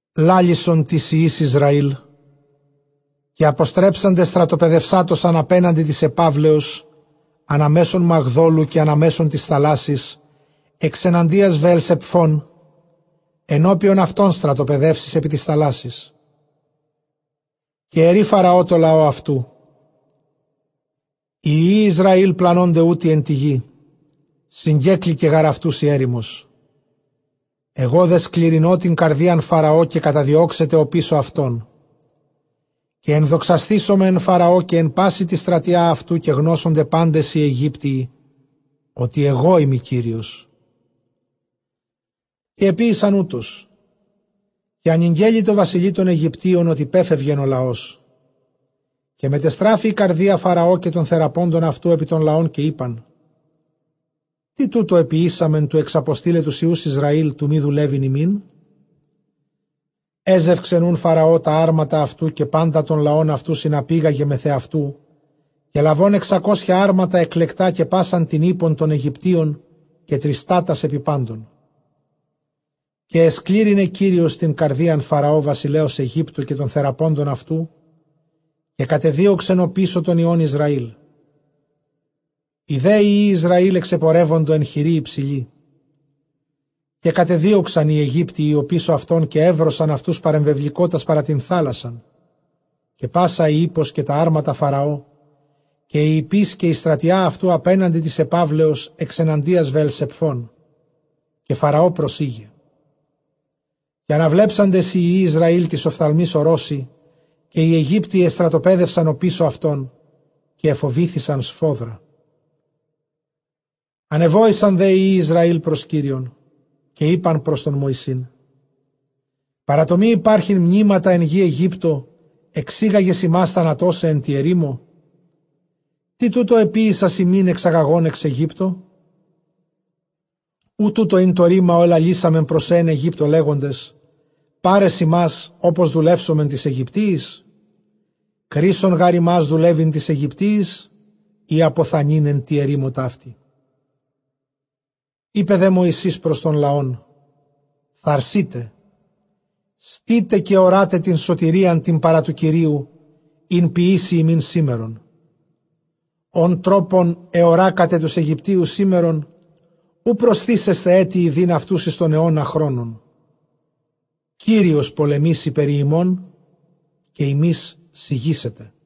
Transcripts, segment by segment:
Λάλησον τοῖς υἱοῖς Ἰσραὴλ, καὶ ἀποστρέψαντες στρατοπεδευσάτωσαν ἀπέναντι τῆς ἐπαύλεως, ἀνὰ μέσον Μαγδώλου καὶ ἀνὰ μέσον τῆς θαλάσσης, ἐξεναντίας Βεελσεπφῶν· ἐνώπιον αὐτῶν στρατοπεδεύσεις ἐπὶ τῆς θαλάσσης. Καὶ ἐρεῖ Φαραὼ τῷ λαῷ αὐτοῦ, οἱ υἱοὶ Ἰσραὴλ πλανῶνται οὗτοι ἐν τῇ γῇ, συγκέκλεικε γὰρ αὐτοὺς ἡ ἔρημος. Ἐγὼ δὲ σκληρυνῶ τὴν καρδίαν Φαραὼ, καὶ καταδιώξεται ὀπίσω αὐτῶν· καὶ ἐνδοξασθήσομαι ἐν Φαραῷ, καὶ ἐν πάσῃ τῇ στρατίᾳ αὐτοῦ· καὶ γνώσονται πάντες οἱ Αἰγύπτιοι ὅτι ἐγώ εἰμι Κύριος· καὶ ἐποίησαν οὕτως. Καὶ ἀνηγγέλη τῷ βασιλεῖ τῶν Αἰγυπτίων ὅτι πέφευγεν ὁ λαός· καὶ μετεστράφη ἡ καρδία Φαραὼ, καὶ τῶν θεραπόντων αὐτοῦ, ἐπὶ τὸν λαὸν, καὶ εἶπαν, τί τοῦτο ἐποιήσαμεν, τοῦ ἐξαποστεῖλαι τοὺς υἱοὺς Ἰσραὴλ, τοῦ μὴ δουλεύειν ἡμῖν; Ἔζευξεν οὖν Φαραὼ τὰ ἅρματα αὐτοῦ, καὶ πάντα τὸν λαὸν αὐτοῦ συναπήγαγε μεθʼ ἑαυτοῦ, καὶ λαβὼν ἑξακόσια ἅρματα ἐκλεκτὰ, καὶ πᾶσαν τὴν ἵππον τῶν Αἰγυπτίων, καὶ τριστάτας ἐπὶ πάντων. Καὶ ἐσκλήρυνε Κύριος τὴν καρδίαν Φαραὼ βασιλέως Αἰγύπτου, καὶ τῶν θεραπόντων αὐτοῦ, καὶ κατεδίωξεν ὀπίσω τῶν υἱῶν Ἰσραήλ· οἱ δὲ υἱοὶ Ἰσραὴλ ἐξεπορεύοντο ἐν χειρὶ ὑψηλῇ. Καὶ κατεδίωξαν οἱ Αἰγύπτιοι ὀπίσω αὐτῶν, καὶ εὕροσαν αὐτοὺς παρεμβεβληκότας παρὰ τὴν θάλασσαν· καὶ πᾶσα ἡ ἵππος καὶ τὰ ἅρματα Φαραὼ, καὶ οἱ ἱππεῖς, καὶ ἡ στρατιὰ αὐτοῦ ἀπέναντι τῆς ἐπαύλεως, ἐξεναντίας Βεελσεπφῶν. Καὶ Φαραὼ προσῆγε· καὶ ἀναβλέψαντες οἱ υἱοὶ Ἰσραὴλ τοῖς ὀφθαλμοῖς ὁρῶσι, καὶ οἱ Αἰγύπτιοι ἐστρατοπέδευσαν ὀπίσω αὐτῶν· καὶ ἐφοβήθησαν σφόδρα· ἀνεβόησαν δὲ οἱ υἱοὶ Ἰσραὴλ πρὸς Κύριον. Καὶ εἶπαν πρὸς Μωυσῆν, παρὰ τὸ μὴ ὑπάρχειν μνήματα ἐν γῇ Αἰγύπτῳ, ἐξήγαγες ἡμᾶς θανατῶσαι ἐν τῇ ἐρήμῳ· τί τοῦτο ἐποίησας ἡμῖν, ἐξαγαγὼν ἐξ Αἰγύπτου; Οὐ τοῦτο ἦν τὸ ῥῆμα, ὃ ἐλαλήσαμεν πρὸς σὲ ἐν Αἰγύπτῳ, λέγοντες, πάρες ἡμᾶς, ὅπως δουλεύσωμεν τοῖς Αἰγυπτίοις; κρεῖσσον γὰρ ἡμᾶς δουλεύειν τοῖς Αἰγυπτίοις, ἢ ἀποθανεῖν ἐν τῇ ἐρήμῳ ταύτῃ. Εἶπε δὲ Μωυσῆς πρὸς τὸν λαὸν, θαρσεῖτε, στῆτε καὶ ὁρᾶτε τὴν σωτηρίαν τὴν παρὰ τοῦ Κυρίου, ἣν ποιήσει ἡμῖν σήμερον· ὃν τρόπον γὰρ ἑωράκατε τοὺς Αἰγυπτίους σήμερον, οὐ προσθήσεσθε ἔτι ἰδεῖν αὐτοὺς εἰς τὸν αἰῶνα χρόνον· Κύριος πολεμήσει περὶ ὑμῶν, καὶ ὑμεῖς σιγήσετε.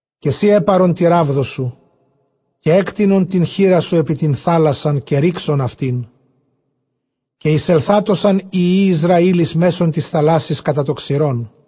Καὶ σὺ ἔπαρον τῇ ῥάβδῳ σου, καὶ ἔκτεινον τὴν χεῖρά σου ἐπὶ τὴν θάλασσαν, καὶ ῥῆξον αὐτήν· καὶ εἰσελθάτωσαν οἱ υἱοὶ Ἰσραὴλ εἰς μέσον τῆς θαλάσσης κατὰ τὸ ξηρόν.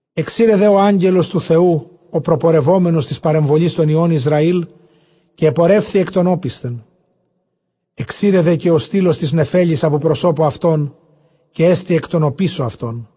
Ἐξῇρε δὲ ὁ Ἄγγελος τοῦ Θεοῦ ὁ προπορευόμενος τῆς παρεμβολῆς τῶν υἱῶν Ἰσραὴλ, καὶ ἐπορεύθη ἐκ τῶν ὄπισθεν· ἐξῇρε δὲ καὶ ὁ στύλος τὴς νεφέλης ἀπὸ προσώπου αὐτῶν, καὶ ἔστη ἐκ τῶν ὀπίσω αὐτῶν.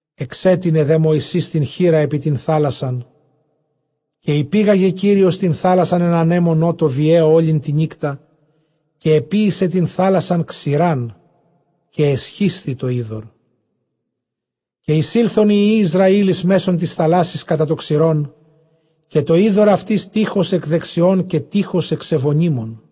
Ἐξέτεινε δὲ Μωυσῆς τὴν χεῖρα ἐπὶ τὴν θάλασσαν· καὶ ὑπήγαγε Κύριος τὴν θάλασσαν ἐν ἀνέμῳ νότῳ βιαίῳ ὅλην τὴν νύκτα, καὶ ἐποίησε τὴν θάλασσαν ξηράν· καὶ ἐσχίσθη τὸ ὕδωρ. Καὶ εἰσῆλθον οἱ υἱοὶ Ἰσραὴλ εἰς μέσον τῆς θαλάσσης κατὰ τὸ ξηρόν· καὶ τὸ ὕδωρ αὐτῆς τεῖχος ἐκ δεξιῶν, καὶ τεῖχος ἐξ εὐωνύμων.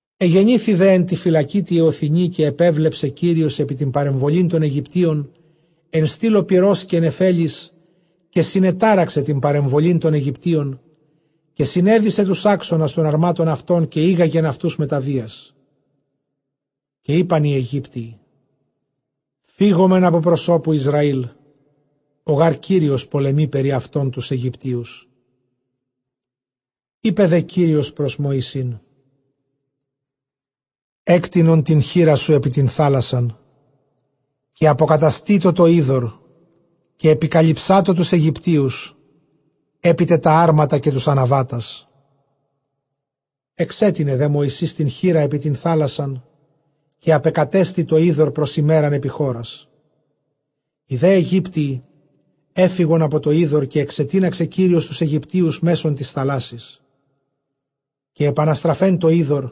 Ἐγενήθη δὲ ἐν τῇ φυλακῇ τῇ ἑωθινῇ, καὶ ἐπίβλεψε Κύριος ἐπὶ τὴν παρεμβολὴν τῶν Αἰγυπτίων ἐν στύλῳ πυρὸς καὶ νεφέλης, καὶ συνετάραξε τὴν παρεμβολὴν τῶν Αἰγυπτίων, καὶ συνέδησε τοὺς ἄξονας τῶν ἁρμάτων αὐτῶν, καὶ ἤγαγεν αὐτοὺς μετὰ βίας· καὶ εἶπαν οἱ Αἰγύπτιοι, φυγωμεν ἀπὸ προσώπου Ἰσραήλ· ὁ γὰρ Κύριος πολεμεῖ περὶ αὐτῶν τοὺς Αἰγυπτίους. Εἶπε δὲ Κύριος πρὸς Μωυσῆν, ἔκτεινον τὴν χεῖρά σου ἐπὶ τὴν θάλασσαν, καὶ ἀποκαταστήτω τὸ ὕδωρ, καὶ ἐπικαλυψάτω τοὺς Αἰγυπτίους, ἐπί τε τὰ ἅρματα καὶ τοὺς ἀναβάτας. Ἐξέτεινε δὲ Μωυσῆς τὴν χεῖρα ἐπὶ τὴν θάλασσαν, καὶ ἀπεκατέστη τὸ ὕδωρ πρὸς ἡμέραν ἐπὶ χώρας· οἱ δὲ Αἰγύπτιοι ἔφυγον ὑπὸ τὸ ὕδωρ· καὶ ἐξετίναξε Κύριος τοὺς Αἰγυπτίους μέσον τῆς θαλάσοης. Καὶ ἐπαναστραφὲν τὸ ὕδωρ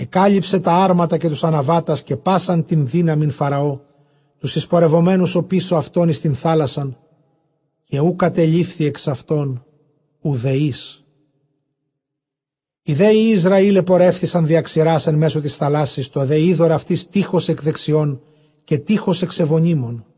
ἐκάλυψε τὰ ἅρματα καὶ τοὺς ἀναβάτας, καὶ πᾶσαν τὴν δύναμιν Φαραὼ, τοὺς εἰσπεπορευμένους ὀπίσω αὐτῶν εἰς τὴν θάλασσαν· καὶ οὐ κατελείφθη ἐξ αὐτῶν οὐδὲ εἷς. Οἱ δὲ υἱοὶ Ἰσραὴλ ἐπορεύθησαν διὰ ξηρᾶς ἐν μέσῳ τῆς θάλασσης· τὸ δὲ ὕδωρ αὐτοῖς τεῖχος ἐκ δεξιῶν, καὶ τεῖχος ἐξ εὐωνύμων.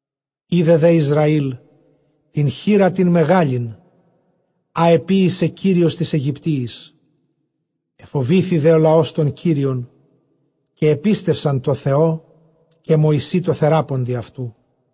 Εἶδε δὲ Ἰσραὴλ τὴν χεῖρα τὴν μεγάλην, ἃ ἐποίησε Κύριος τοῖς Αἰγυπτίοις· ἐφοβήθη δὲ ὁ λαὸς τὸν Κύριον, καὶ ἐπίστευσαν τῷ Θεῷ, καὶ Μωυσῇ τῷ θεράποντι αὐτοῦ.